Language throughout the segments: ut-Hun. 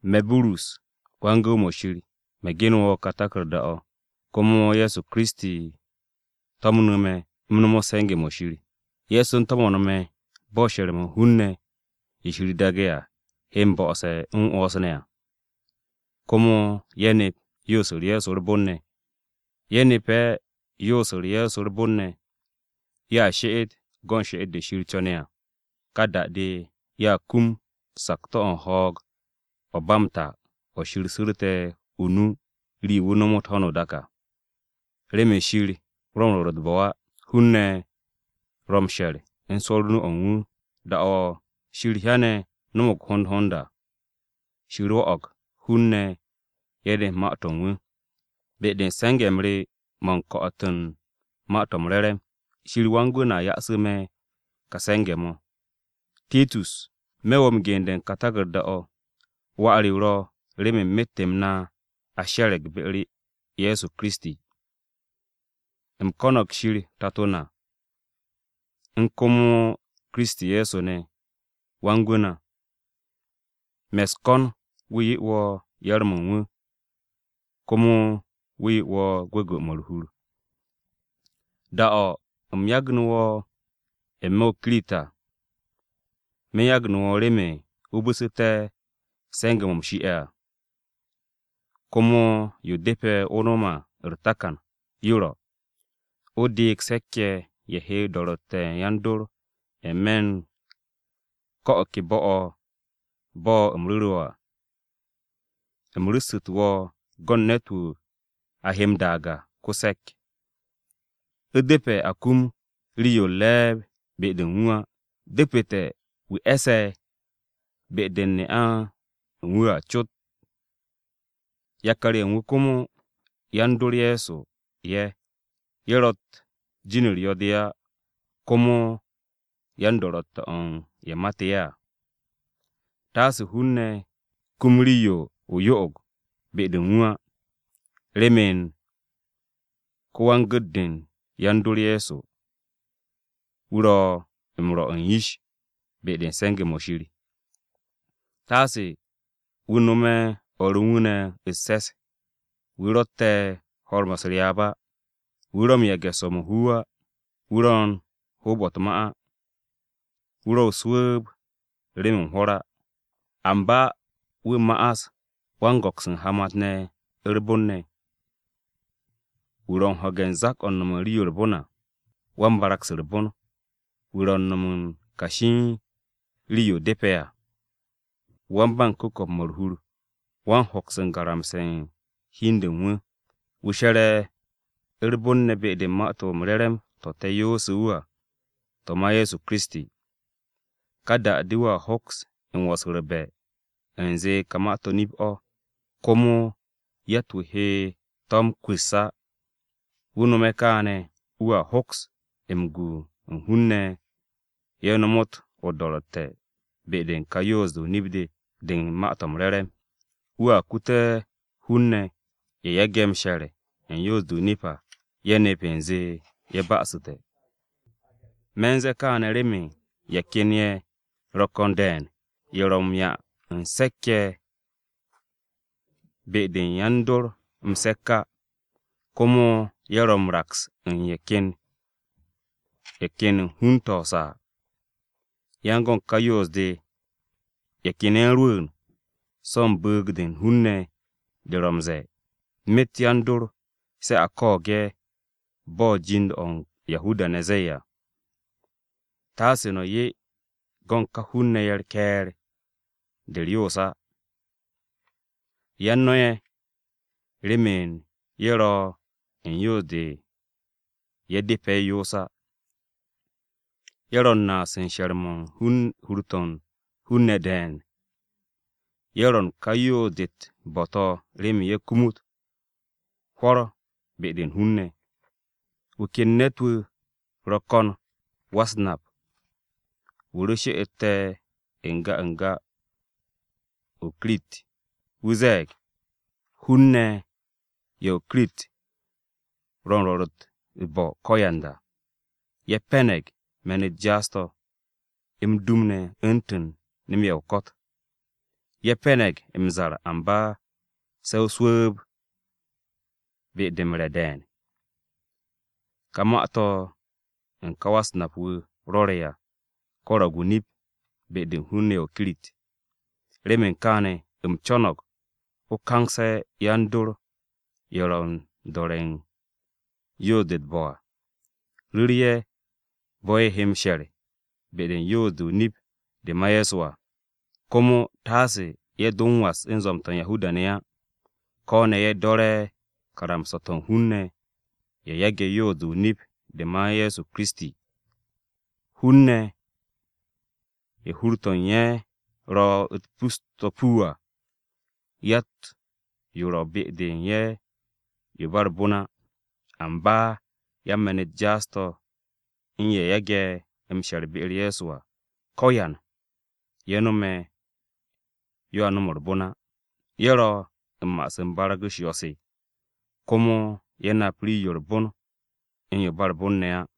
Me̱, Burus, wan-gu̱w-mo̱ Shir, me̱ ge̱ndu̱ wo̱ ka taku̱rda-o̱. Komo Ye̱so Kiristi to̱mnu̱ me̱ u̱m nomot se̱nge̱-mo̱ Shir. Ye̱so u̱n to̱mo̱n me̱ bo̱ she̱r-mo̱ u̱n hun-ne̱ ye̱ Shir daage̱ à, he m-bo̱'o̱se̱ m-'wo̱ns ne̱ à. Komo ye̱a nep yoos-u̱r Ye̱so u̱r-bon ne̱. Ye̱ nepe̱ yoos-u̱r Ye̱so u̱r-bon ne̱, ye̱a she'et go̱n she'et-de Shir co̱ne̱ à. Ka da-de, ye̱a kum sakto̱-o̱ u̱n ho̱o̱g-o̱ ba m-ta o̱ Shir su̱rte̱ o-nu rii-yo wu̱ nomot ho̱no o-dak à. Remen Shir ro̱ m-rwo̱r u̱t-bo̱ á, hun-ne̱ ro̱ m-she̱r u̱n swo̱-u̱r o-nu o̱ u̱n wu̱. Da-o̱ Shir hyane̱ no̱mo̱g hond hond à, Shir rwo̱'o̱g hun-ne̱ ye̱ nep Ma-to̱ u̱n wu̱, be-de u̱n se̱nge̱-m re mo̱ u̱n ko̱'o̱t u̱n Ma-to̱ m-Re̱re̱m. Shir Wan-Gwu̱ na ya'asu̱ me̱ ka se̱nge̱-mo̱. Titus, me̱ wo̱ m-gende̱ u̱n ka taku̱rda-o̱. Wà re o ro̱ remen myet-m na a she̱re̱g be-u̱r Ye̱so Kiristi. U̱m ko̱no̱g Shir Tato na, u̱n komo Kiristi Ye̱so ne̱, Wan-Gwu̱ na. Me̱ u̱s-ko̱n wu̱ 'ye wo̱ yar-mo̱ u̱n wu̱, komo wu̱ 'ye wo̱ gwu̱gwu̱-mo̱ u̱r-hur! Da-o̱ u̱m yagnu̱ wo̱ n-me̱ o-Kirit à, me̱ u̱n yagnu̱ wo̱ remen o bu̱su̱té̱ se̱nge̱-mo̱ a shie̱ à. Komo yo depe̱ o nom u̱r-takan à, yo ro̱: o deeg se̱k-ye̱ ye̱ he do̱ro̱tte̱ u̱n yan-dor n-me̱ u̱n ko̱ o̱ ke bo̱-o̱, bo̱ u̱m ru̱ru̱ wo̱ à. U̱m ru̱ssu̱tu̱ wo̱ go̱n ne̱t-wu̱ a he m-daag à. Ko-se̱k: U̱depe̱ a kum rii-yo u̱r-re̱e̱b be-de u̱n wu̱ á. Depu̱te̱ wu̱ e̱se̱ be-de u̱n ne'a u̱n wu̱ cot à. Yakar-ye̱ u̱n wu̱ komo, yan-dor Ye̱so ye̱. (Ye̱ ro̱tt jin-u̱r yo̱-de á, komo yan-do̱ro̱tte̱-o̱ u̱n ye̱ mate̱ ye̱ à). Taase hun-ne̱ kum rii-yo o-yo'og be-de u̱n wu̱ á. (Remen ko-wan-gu̱t-de u̱n yan-dor Ye̱so, wu̱ ro̱ m-rwo̱ u̱n yish be-de u̱n se̱nge̱-mo̱ Shir.) Taase wu̱ nome̱ o̱r u̱n wu̱ ne̱ u̱s-se̱s, Wu̱ ro̱tte̱ ho̱r-mo̱ u̱s-ryaab á, Wu̱ ro̱ u̱n yage̱ swo̱-mo̱ ho wu̱ á. Wu̱ ro̱ u̱n hoob-o̱ u̱t-ma á. Wu̱ ro̱ o-su̱u̱b remen hwo̱r á. Amba wu̱ ma'as ko-wan-go̱ks u̱n hamat-ne̱ u̱r-bon ne̱. Wu̱ ro̱ u̱n ho̱ge̱ u̱n zak-o̱ u̱n nom u̱n rii-yo u̱r-bon à. Wan-barag-se u̱r-bon. Wu̱ ro̱ u̱n no̱m u̱n kashi u̱n rii-yo depe̱ à. Wan-ba-m-ku̱ko̱p u̱n ku̱ko̱p-mo̱ u̱r-hur. Wan-hoks u̱n garamse̱ u̱n hi u̱n de u̱n wu̱. Wu̱ she̱re̱ u̱r-bon ne̱ be-de u̱n Ma-to̱ m-Re̱re̱m to̱ te̱ yoose̱ wu̱ à, to̱ ma Ye̱so Kiristi. Ka da-de wu̱a hoks m-wo̱s u̱r-be̱ u̱nze ka ma-to̱ nip-o̱ komo yatt-wu̱ he to̱ m-kwu̱s á. Wu̱ no̱me̱ kaane̱ wu̱a hoks m-gu u̱n hun-ne̱ ye̱ nomot o-do̱ro̱tte̱ be-de u̱n ka yoos-de o-nip de, de u̱n Ma-to̱ m-Re̱re̱m. Wu̱a kute̱ hun-ne̱ ye̱ yage̱ m-she̱r u̱n yoos-de o-nip à, ye̱ nep u̱nze ye̱ ba'asu̱te̱. Me̱ u̱n ze̱e̱ kaane̱ remen ye̱ ken ye̱ ro̱ ko̱n de̱e̱n, ye̱ ro̱ m-'ya u̱n se̱k-ye̱ be-de u̱n yan-dor m-se̱k á. Komo ye̱ ro̱ m-raks u̱n ye̱ ken u̱n hun-to̱ o-saa. Yan go̱n ka yoos-de ye̱ ken ye̱ u̱n rwu̱u̱n so̱ u̱n bu̱u̱g-de u̱n hun-ne̱ de ro̱ m-ze̱e̱: myet yan-dor se̱ a ko̱o̱g ye̱ bo̱ jind-o̱ u̱n Yahuda-ne̱ ze̱e̱ à. Taase no̱ 'ye go̱n ka hun-ne̱ ye̱ u̱r-ke̱e̱r de u̱r-yoos á. Yan no̱ ye̱, remen ye̱ ro̱ u̱n yoos-de yo depe̱ ye̱ yoos á, ye̱ ro̱ naas u̱n she̱r-mo̱ u̱n hur-to̱ u̱n hun-ne̱ de̱e̱n. Ye̱ ro̱ u̱n ka yoos-de u̱t-bo̱ to̱ remen ye̱ kumut hwo̱r be-de u̱n hun-ne̱. Wu̱ ken ne̱t-wu̱ ro̱ ko̱n wa-u̱s-nap, wu̱ ro she'ete̱ n-ga n-ga u̱n o-Kirit. Wu̱ ze̱e̱g: “Hun-ne̱ ye̱ o-Kirit ro̱ u̱n rwo̱r u̱t-bo̱ ko̱yanda. Ye̱ pe̱ne̱g me̱n-u̱t jaas-to̱, m-dum ne̱ u̱ntu̱n nem-ye̱ o-ko̱t. Ye̱ pe̱ne̱g m-zar amba se̱ o-su̱u̱b be-de m-re̱ de̱e̱n.” Ka ma-to̱ u̱n ka wa-u̱s-nap-wu̱ rwo̱re̱ à, ko̱ro̱g o-nip be-de u̱n hun-ne̱ ye̱ u̱n o-Kirit. Remen kaane̱ u̱m co̱no̱g o kangse̱ yan-dor ye̱ ro̱ u̱n do̱re̱ u̱n yoos-de u̱t-bo̱ à. Ru̱ru̱ ye̱ bo̱ ye̱ he m-she̱r be-de u̱n yoos-de o-nip de ma Ye̱so à. Komo taase ye̱ do m-was u̱n zwo̱m-to̱ u̱n Yahuda-ne̱ á, ko̱ ne̱ ye̱ do̱re̱ karamsa-to̱ u̱n hun-ne̱ ye̱ yage̱ yoos-de o-nip de ma Ye̱so Kiristi. Hun-ne̱ ye̱ hur-to̱ u̱n ye̱ ro̱ u̱t-pus to̱ puu à, yatt-yo ro̱ be-de u̱n ye̱ yo u̱n ba u̱r-bon á. Amba yan-me̱n-u̱t jaas-to̱ u̱n ye̱ yage̱ m-she̱r be-u̱r Ye̱so à, ko̱yan ye̱ no̱me̱ yoa nom u̱r-bon á. Ye̱ ro̱ u̱n ma'as u̱n barag-u̱s yo̱-se, komo hur-de u̱n ye̱ kapste̱ ye̱.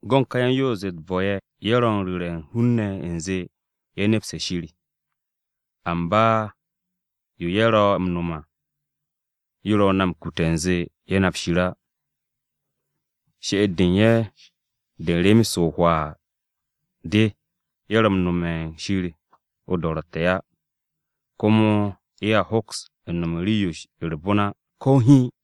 Go̱n ka yan-yoos-de u̱t-bo̱ ye̱, ye̱ ro̱ u̱n ru̱re̱ u̱n hun-ne̱ u̱nze ye̱ nepse̱ Shir. Amba yo ye̱ ro̱ m-nom à yo ro̱ na m-kute̱ u̱nze ye̱ nap Shir á. She'et-de u̱n ye̱ de u̱n rem-se o-hwaa de. Ye̱ ro̱ m-nome̱ u̱n Shir o-do̱ro̱tte̱ á. Komo ye̱a hoks u̱n nom u̱n rii-yo u̱r-bon á, ko̱ hiin.